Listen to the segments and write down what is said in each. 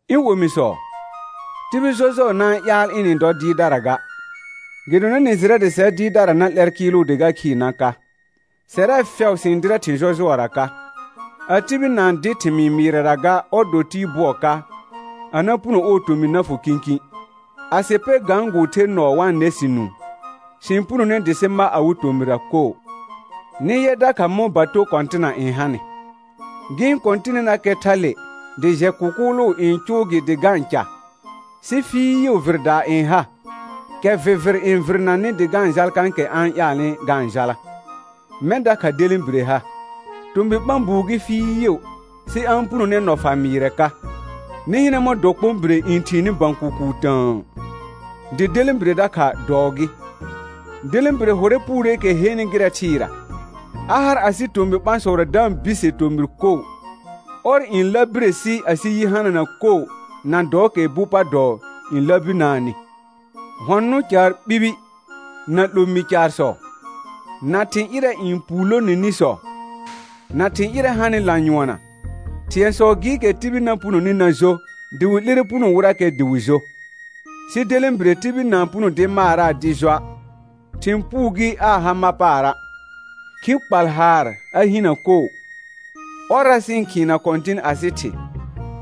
Ɩ̃ omisɔ, tibil jɔjʋɔ na-n ƴaal ɩnɩ-n dɔ dɩɩrdara ga, gɩdonɩ nɩ jɩrɛ dɩ sɛr dɩɩrdara na 'lɛr kɩɩlʋ dɩ ga khɩɩr na ka. Sɛrɛ fɛʋ sɩ-n dɩrɛ thɩ̃ jɔjʋɔra ka. A tibil na-n dɩ thɩmɩɩ mɩɩrɛra ga ɔr dɔ tɩɩ bʋɔ ka, a na puno ɔɔ tomɩ na fʋ kĩkĩ. A sɩ pɛ gãgʋʋ ther nɔɔ wa-n nɛ sɩ nũu, sɩ-n punone dɩ sɩ ma awɩ tomɩra koo. Nɩ yɛ dakha mɔ̃ bato kɔ̃tɩna n hanɩ; gɩ-n kɔ̃tɩnɩnakɛ thale dɩ jɛ kʋkʋʋlʋ n cʋʋ gɩ dɩ ga-n ca, sɩ fɩɩʋ vɩrdaa n ha, kɛ vɩvɩr n vɩrnanɩ dɩ ga-n jal kãkɛ a-n ƴaalnɩ ga-n jala. Mɛ̃ dakha delẽbire ha; tomɩ ɓã buu gɩ fɩɩʋ, sɩ a-n punone nɔ fa mɩɩrɛ ka. Nɩ hɩnɛ mɔ̃ dɔkpõbire n thiini bə̃ kʋkʋʋ tə̃ə. Dɩ delẽbire dakha dɔɔ gɩ. Delẽbire hʋrɛ puureekɛ henɩ gɩrɛ thɩɩra; a har asɩ tomɩ ɓãsɔra da-n bise tomɩr koo. Ɔr n ləbire si asɩ yi hanana koo na dɔɔkɛ bu pa dɔɔ n ləbinaanɩ. Hɔ̃ nʋ̃ caar ɓibi, na 'lomĩ caarsɔ, na thɩ̃ ƴɩrɛ n puulonenisɔ, na thɩ̃ ƴɩrɛ hanɩ lanyʋɔnna, thɩ̃ɛsɔ gɩɩkɛ tibil na punoni na jo dɩ wɩ 'lire puno wɩrakɛ dɩ wɩ jo. Sɩ delẽbire tibil na-n puno dɩ maaraa dɩ joa', thɩ̃ puu gɩ aa ha ma paara', khi kpal haar a hinə koo. Ɔrra sɩ-n khɩɩna Kɔ̃tɩn asɩ Thɩ,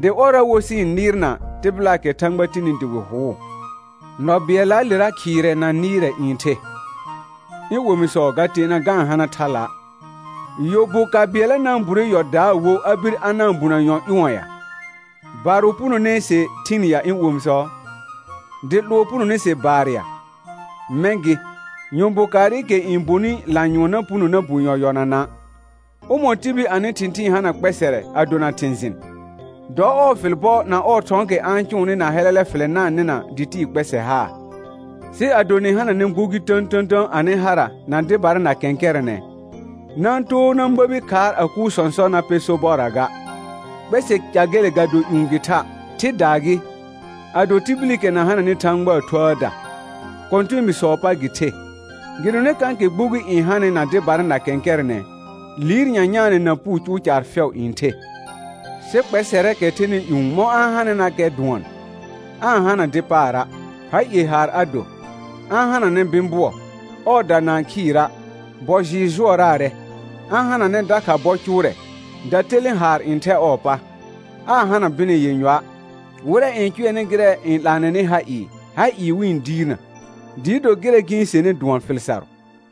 dɩ ɔrra wo sɩ-n nɩɩrna tɩbɩlaakɛ Thãgba tini dɩ wɩ hʋʋ. Nɔ bɩɛllaalera khɩɩrɛ na nɩɩrɛ n the. Ɩ̃ omisɔ ga teena ga-n hana thala'. Yɔ bu ka bɩɛlla na-n bure yɔ daa wo a bir a na-n bunə yɔ ƴʋ̃ɔ ya? Barʋ punone se thɩn ya ɩ̃ omisɔ? Dɩ 'lʋɔ punone se baar ya? Mɛ̃ gɩ, yɔ bu kaarɩkɛ n bonɩ lanyʋɔn na puno na bu yɔ yɔnana'. Ʋmɔ̃ɔ tibil anɩ thɩ̃thɩɩn hana kpɛsɛrɛ a dona thɩ̃ jɩn? Dɔ ɔɔ fɩl bɔ na ɔɔ thɔ̃ɔkɛ a-n cʋʋnɩ na hɛlɛlɛ fɩlɛ na-n nɩna dɩ tɩɩ kpɛsɛ haa. Sɩ ado nɩ hananɛ gbugi tə̃tə̃tə̃ anɩ hara na dɩbara na kɛ̃kɛrɛnɛ, na-n too na məbi khaar a kuur sɔ̃sɔ na pɛ sobɔrra ga. Kpɛsɛ ca gele ga do ƴũ gɩ tha', thɩdaa gɩ, a do tibilikɛ na hananɩ Thãgbaa Thuəəda, kɔ̃tɛɛbiisɔɔ pa gɩ the. Gɩdonɩ kãkɛ gbugi n hanɩ na dɩbara na kɛ̃kɛrɛnɛ, liir nyanyaanɛ na puu cʋʋ caar fɛʋ n the. Sɩ kpɛsɛrɛɛkɛ thɛnɩ ƴũ mɔ̃ a-n hanɩnakɛ dʋɔn: Aa-n hana dɩ paara', ha ie haar a do, a-n hananɛ bɩ̃ bʋɔ, ɔɔda na-n khɩɩra', bɔ jɩɩr jʋɔraarɛ, a-n hananɛ dakha bɔ cʋʋrɛ, datelẽ haar n thɛ ɔɔ pa, aa hana bɩnɛ yenyɔa'. Wɩrɛ n cʋɛnɩ gɩrɛ n 'laanɛnɩ ha ɩɩ, ha ɩɩ wɩ-n diirnə, dɩɩ do gɩrɛ gɩ-n senɩ dʋɔn fɩl sarʋ.